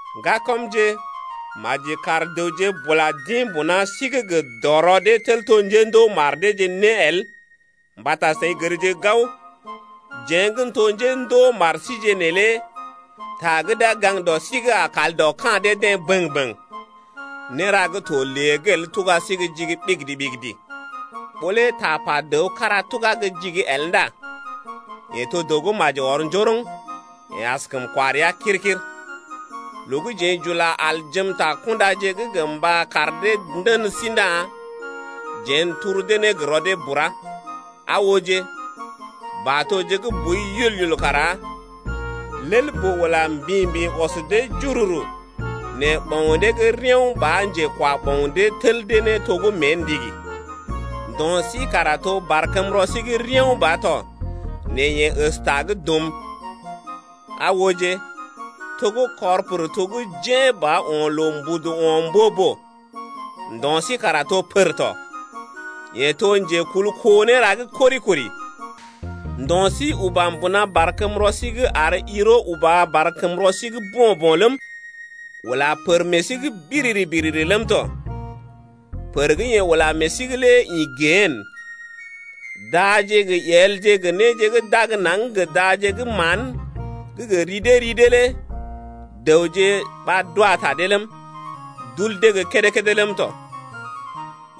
Ŋgakɔmje, maji kar dəwje bula d’ḭ mbuna sí’g gə dɔrɔ dee tel to njendoo mar deeje né el mbata seḭ gərje gao, jeḛ gə́ n’to njendoo mar síje neelé ta gə́ d’a gaŋg dɔ sí’g a kal dɔ ka̰ dee-deḛ bəŋ-bəŋ. Néra gə́ to lée’g el tuga sí gə́ jigi ɓigidi-ɓigidi. Ɓó lé tapa dəw kára tugá gə́ jigi el ndá yeḛ to dəw gə́ maji ɔr njoroŋ, yeḛ askəm kwa rəa kir-kir. Loo gə́ jeḛ j’ula aljem ta kundaje’g gə mba kar dee ndən sí ndá jeḛ n’turu dee ne gə rɔ dee bura. Aa ooje, batoje gə́ boi yul-yul kara lel-boo ula mbḭ-mbḭ ɔs dee jururu nɛ ɓoŋ dee gə́ reao̰ ba njekwa ɓoŋ dee tel dee ne to gə́ mée ndigi. Ndo̰ sí kara to barkəmrɔ sí gə́ reao̰ ba to nɛ yeḛ əsta gə́ dum. Aa ooje, to gə́ kɔr pər to gə́ jḛ̀ ba o̰ loo mbudu o̰ mbo-boo. Ndo̰ sí kara to pər tɔ. Yee to njekul kó néra gə́ kori-kori. Ndo̰ sí uba mbuna barkəmrɔ sí’g ar yiro uba barkəmrɔ sí’g bo̰-bo̰ ləm, ula pər meḛ sí’g biriri-biriri ləm tɔ. Pər gə́ yee ula meḛ sí’g lé ḭ gehene. Daje gə yelje gə néje gə́ d’ag naŋg gə daje gə́ mán gə́ gə ri dee ri dee lé dəwje ɓa d’wa ta dee ləm, d’ul dee gə́ kédé-kédé ləm tɔ.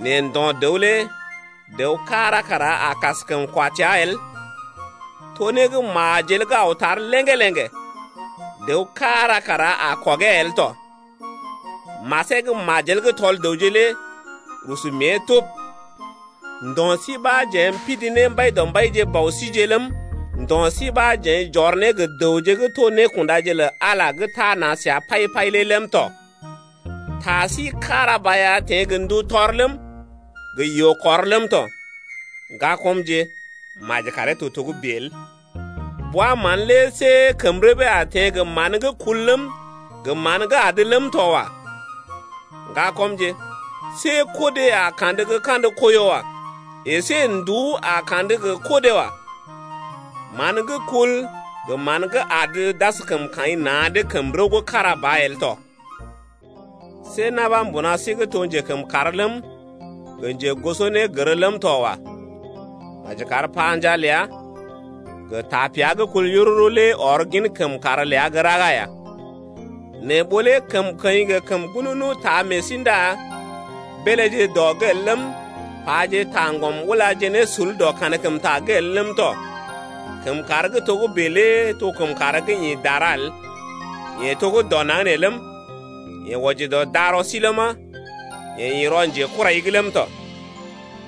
Nɛ ndo̰ dəw lé dəw kára kara a kaskəm kwa təa el, to né gə́ majel gə́ aw tar léŋgé-léŋgé, dəw kára kara a kɔgee el tɔ. Masee gə́ majel gə́ tɔl dəwje lé rusu mée tub. Ndo̰ sí ɓa jeḛ m’pidi ne Mbaidɔmbaije Bɔ síje’g ləm, ndo̰ sí ɓa jeḛ j’ɔr ne gə dəwje gə́ to nékundaje lə Ala lé gə́ tana səa pai-pai lé ləm tɔ. Ta sí kára ba ya teḛ gə ndu tɔr ləm, gə yoo-kɔr ləm tɔ. Ŋgakɔmje, maji karee to togə́bè el. Bwa-mán lé see kəm rəbee a teḛ gə mán gə́ kul ləm, gə mán gə́ adə ləm tɔ wa. Ŋgakɔmje, see kodé a kandə gə kandə koiyo wa. Esé nduú a kandə gə kodé wa. Man gə́ kul gə mán gə́ adə d’askəm kaḭ na̰’d kəm rəw gə́ kára ba el tɔ. See na̰ ɓa mbuna sí’g to njekəmkàr ləm, gə njegosonégər ləm tɔ wa. Maji kar panjaa ləa gə tapea gə́ kul yururu lé ɔr gin kəmkàr ləa gə́ raga ya. Nɛ ɓó lé kəmkəḭ gə kəm ŋgununu taa meḛ sí ndá beeléje dɔ’g el ləm, paje taŋgɔm ula ne sul dɔ kankəmta’g el ləm tɔ. Kəmkàr gə́ togə́bè lé to kəmkàr gə́ ḭ dara el. Yee to gə́ dɔ naŋg nee ləm, yee wɔji dɔ darɔ sí ləma, yee ḭ rɔ njekurai’g ləm tɔ.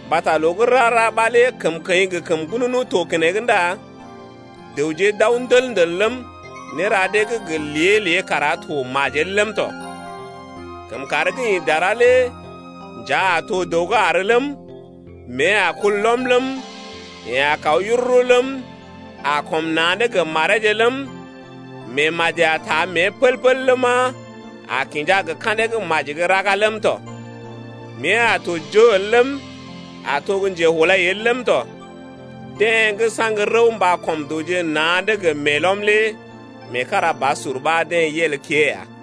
Mbata loo gə́ rara ɓa lé kəmkəḭ gə kəm ŋgununu to keneŋ ndá dəwje d’aw ndəl-ndəl ləm, néra dee gə́ gə lée-lée kara to majel ləm tɔ. Kəmkàr gə́ ḭ dara lé njea a to dəw gə́ àr ləm, mée a kul lɔm ləm, yeḛ a kaw yururu ləm, a kɔm na̰’d gə mareeje ləm, meemaji a taa mée pəl-pəl ləma, a kinja gə ka̰dee gə́ maji gə́ raga ləm tɔ. Mée a tɔ joo el ləm, a to gə́ njehulai el ləm tɔ. Deḛ gə́ saŋg rəw mba kɔm dəwje na̰’d gə meelɔm lé meekarabasur ɓa deḛ yel kée ya.